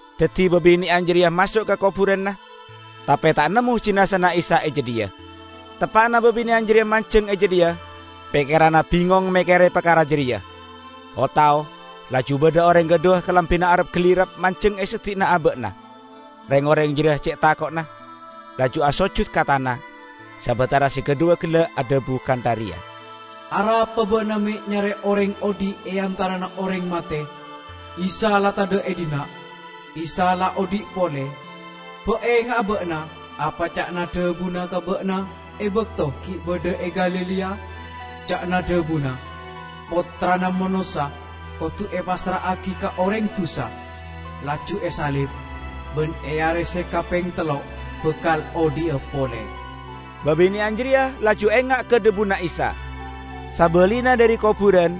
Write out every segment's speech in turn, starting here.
Daddi babine'an jareya maso' ka koburanna, tape ta' nemmo jinazana Isa e jadhiya. Teppa'na babine'an jareya manjeng e jadhiya, pekkeranna bingong mekkere parkara jareya, o-tao laju badha oreng kadhuwa kalambina arap-galirap manjeng e seddi'na aba'na. Reng-oreng jareya ce' tako'na, laju asojud ka tana sabatara se kadhuwa gella' adhabu kantha reya, "Arapa ba'na me' nyare oreng odhi' e antarana oreng mate? Isa la tadha' e dhinna'. Isa la odhi' pole! Ba' enga'a ba'na apa ca'na dhabuna ka ba'na e bakto gi' badha e Galilea? Ca'na dhabuna, 'Pottrana Manossa kodu epassra'agi ka oreng dusa, laju esalib, ban e are se kapeng tello' bakal odhi'a pole.' " Babine'an jareya laju enga' ka dhabuna Isa. Sabalina dhari koburan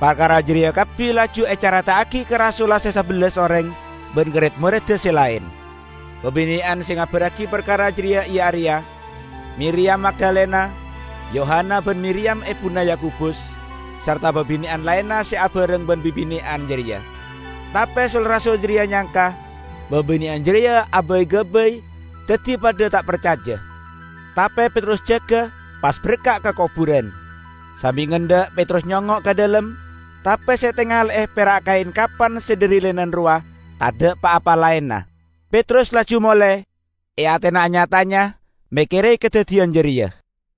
parkara jareya kabbi laju ecareta'agi ka rasulla se sabellas oreng ban ka red-moredda se laen. Babine'an se ngabarragi parkara jareya iya areya: Miriyam Magdalena, Yohana ban Miriyam ebuna Yakobus, sarta babine'an laenna se abareng ban babine'an jareya. Tape sul-rasul jareya nyangka babine'an jareya abay-gabay, daddi padha ta' parcaja. Tape Petrus jaga, pas berka' ka koburan. Sambi ngendha' Petrus nyongngo' ka dhalem, tape se etangale'e pera' kaen kapan se dhari linen rowa, tadha' pa-apa laenna. Petrus laju mole, e atena anya-tanya mekkere kadaddiyan jareya.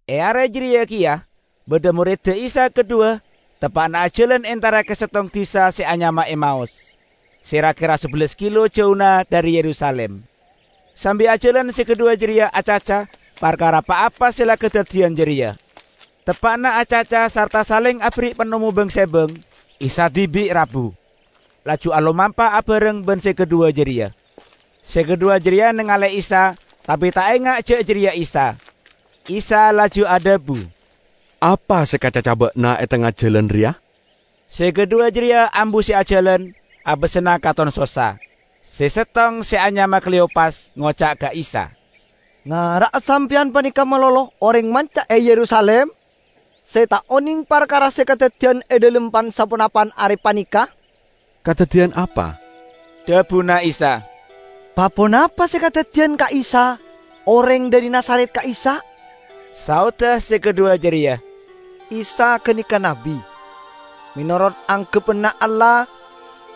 E are jareya keya badha moredda Isa kadhuwa teppa'na ajalan entara ka settong disa se anyama Emaus, se ra-kera sabellas kilo jauna dhari Yerusalim. Sambi ajalan se kadhuwa jareya acaca parkara pa-apa se la kadaddiyan jareya. Teppa'na acaca sarta saleng aberri' panemmo bang-sebang, Isa dibi' rabu, laju alomampa abareng ban se kadhuwa jareya. Se kadhuwa jareya nangale'e Isa tape ta' enga' ja' jareya Isa. Isa laju adhabu, "Apa se ekacaca ba'na e tengnga jalan reya?" Se kadhuwa jareya ambu se ajalan, abasanna katon sossa. Se settong, se anyama Kleyopas, ngoca' ka Isa, "Ngara'a Sampeyan paneka malolo oreng manca e Yerusalim se ta' oneng parkara se kadaddiyan e dhalem pan-saponapan are paneka." "Kadaddiyan apa?" dhabuna Isa. "Pa-ponapa se kadaddiyan ka Isa, oreng dhari Nazaret ka'issa'," saodda se kadhuwa jareya. "Isa ganeka nabbi. Menorot anggebbanna Allah,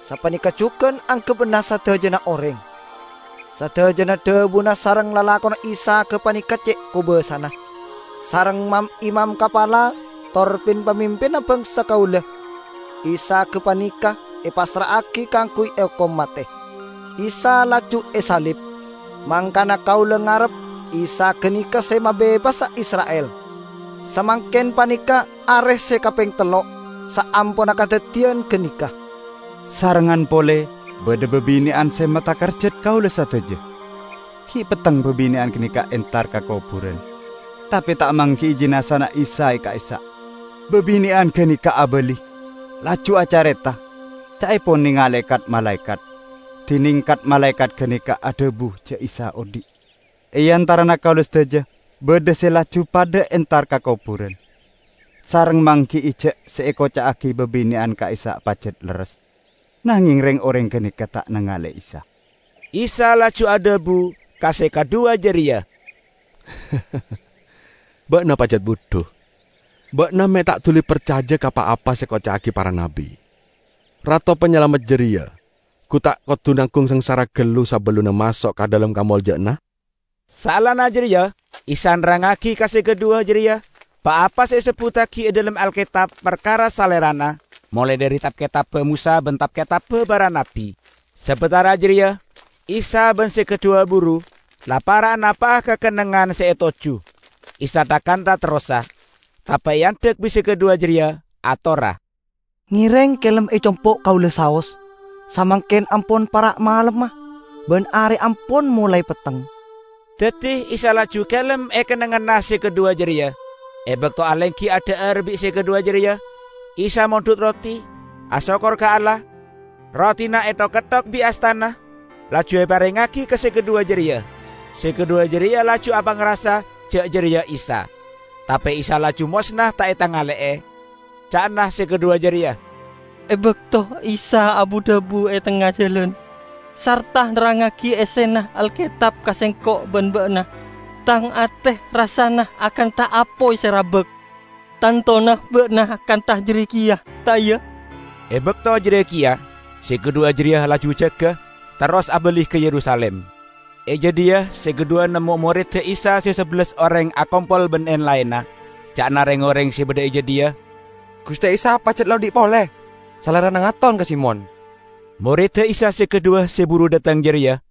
sapaneka jugan anggebbanna sadajana oreng -- sadajana dhabuna sareng lalakonna Isa gapaneka ce' kobasana. Sareng mam-imam kapala tor pin-pamimpinna bangsa kaula Isa gapaneka epassra'agi kaangguy eokom mate; Isa laju esalib. Mangkana kaula ngarep Isa ganeka se mabebasa Isra'il! Samangken paneka are se kapeng tello' saamponna kadaddiyan ganeka.. Sarengngan pole, badha babine'an se matakerjat kaula sadaja. Gi' petteng babine'an ganeka entar ka koburan, tape ta' manggi'i jinazana Isa e ka'issa'. Babine'an ganeka abali, laju acareta, ca'epon nengale kat-malaekat, dineng kat-malaekat ganeka adhabu ja' Isa odhi'. E antarana kaula sadaja badha se laju padha entar ka koburan, sareng manggi'i ja' se ekoca'agi babine'an ka'issa' pajat lerres, nangeng reng-oreng ganeka ta' nengale Isa." Isa laju adhabu ka se kadhuwa jareya, "Ba'na pajat budhu! Ba'na me' ta' duli parcaja ka pa-apa se ekoca'agi para nabbi! Rato Panyalamet jareya gu ta' kodu nanggung sangsara gallu sabellunna maso' ka dhalem kamolja'anna?" Saellana jareya Isa nerrangngagi ka se kadhuwa jareya pa-apa se esebbuttagi e dhalem Alketab parkara Salerana, molae dhari tab-ketabba Mosa ban tab-ketabba para nabbi. Sabatara jareya Isa ban se kadhuwa buru la para' napa'a ka kennengngan se etojju. Isa tha-kantha terrosa, tape eandhek bi' se kadhuwa jareya. Atorra, "Ngereng kelem e compo' kaula saos; samangken ampon para' malemma, ban are ampon molae petteng." Daddi Isa laju kelem e kennengnganna se kadhuwa jareya. E bakto alenggi adha'ar bi' se kadhuwa jareya, Isa mondhut roti, asokkor ka Allah, rotina ethok-ketthok bi' astana, laju eparengngagi ka se kadhuwa jareya. Se kadhuwa jareya laju apangrasa ja' jareya Isa. Tape Isa laju mosna ta' etangale'e. Ca'na se kadhuwa jareya, "E bakto Isa abu-dhabu e tengnga jalan, sarta nerrangngagi essena Alketab ka sengko' ban ba'na, tang ate rassana akantha apoy se rabak. Tantona ba'na kantha jareya keya, ta' iya?" E bakto jareya keya se kadhuwa jareya laju jaga, terros abali ka Yerusalim. E jadhiya se kadhuwa nemmo moredda Isa se sabellas oreng akompol ban en-laenna. Ca'na reng-oreng se badha e jadhiya, "Guste Isa pajat la odhi' pole! Salerana ngaton ka Simon!" Moredda Isa se kadhuwa se buru dhateng jareya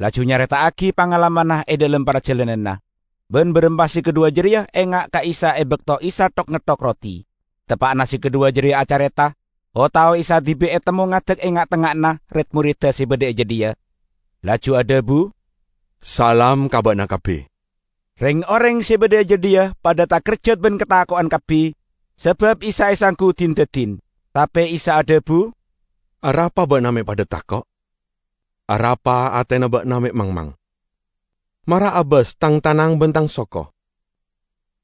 laju nyareta'agi pangalamanna e dhalem parjalananna, ban baramma se kadhuwa jareya enga' ka Isa e bakto Isa thok-ngetthok roti. Teppa'na se kadhuwa jareya acareta, o-tao Isa dibi' etemmo ngadek e nga'-tengnga'anna red-moredda se badha e jadhiya, laju adhabu, "Salam ka ba'na kabbi!" Reng-oreng se badha e jadhiya padha takerjat ban katako'en kabbi, sabab Isa esanggu din-dadin. Tape Isa adhabu, "Arapa ba'na me' padha tako'? Arapa atena ba'na me' mangmang? Mara abas Tang tanang ban Tang soko.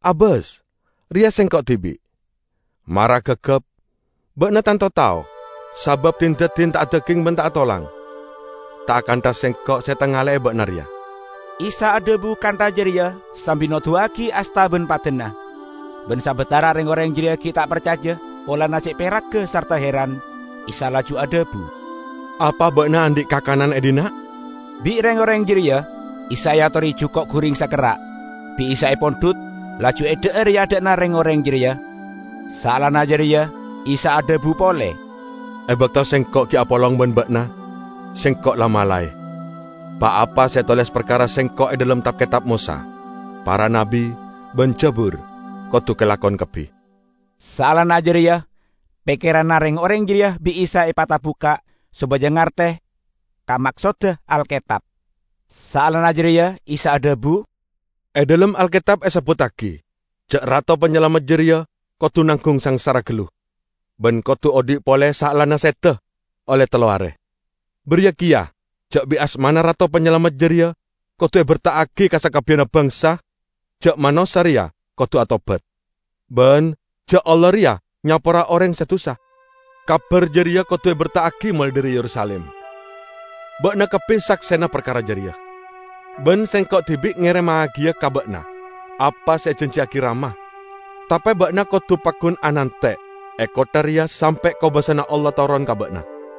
Abas, reya Sengko' dibi'! Mara gagap, ba'na tanto tao, sabab din-dadin ta' adaging ban ta' atolang, ta' akantha Sengko' se etangale'e ba'na reya." Isa adhabu kantha jareya sambi noduwagi asta ban padana. Ban sabatara reng-oreng jareya gi' ta' parcaja, polana ce' peragga sarta heran, Isa laju adhabu, "Apa ba'na andhi' kakanan e dhinna'?" Bi' reng-oreng jareya Isa eatore juko' guring sakerra'. Bi' Isa epondhut, laju edha'ar e adha'na reng-oreng jareya. Saellana jareya Isa adhabu pole, "E bakto Sengko' gi' apolong ban ba'na, Sengko' la malae: Pa-apa se etoles parkara Sengko' e dhalem Tab-ketab Mosa, Para Nabbi ban Jabur, kodu kalakon kabbi." Saellana jareya pekkeranna reng-oreng jareya bi' Isa epatabukka' sopaja ngarte ka maksodda Alketab. Saellana jareya Isa adhabu, "E dhalem Alketab esebbuttagi ja' Rato Panyalamet jareya kodu nanggung sangsara gallu, ban kodu odhi' pole saellana seda olle tello are. Bariya keya ja' bit asmana Rato Panyalamet jareya kodu eberta'agi ka sakabbiyanna bangsa ja' manossa reya kodu atobat, ban ja' Allah reya nyapora oreng se dusa. Kabar jareya kodu eberta'agi molae dhari Yerusalim. Ba'na kabbi saksena parkara jareya. Ban Sengko' dibi' ngeremmagiya ka ba'na apa se ejanjiyagi Rama. Tape ba'na kodu paggun anante' e kottha reya sampe' kobasana Allah toron ka ba'na."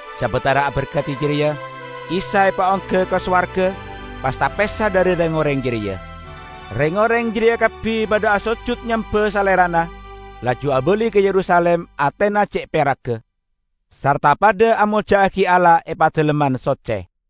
Sabatara aberkadi jareya, Isa epaongga ka sowarga, pas tapesa dhari reng-oreng jareya. Reng-oreng jareya kabbi padha asojud nyemba Salerana, laju abali ka Yerusalim; atena ce' peragga, sarta padha amolja'agi Allah e Padalemman Socce.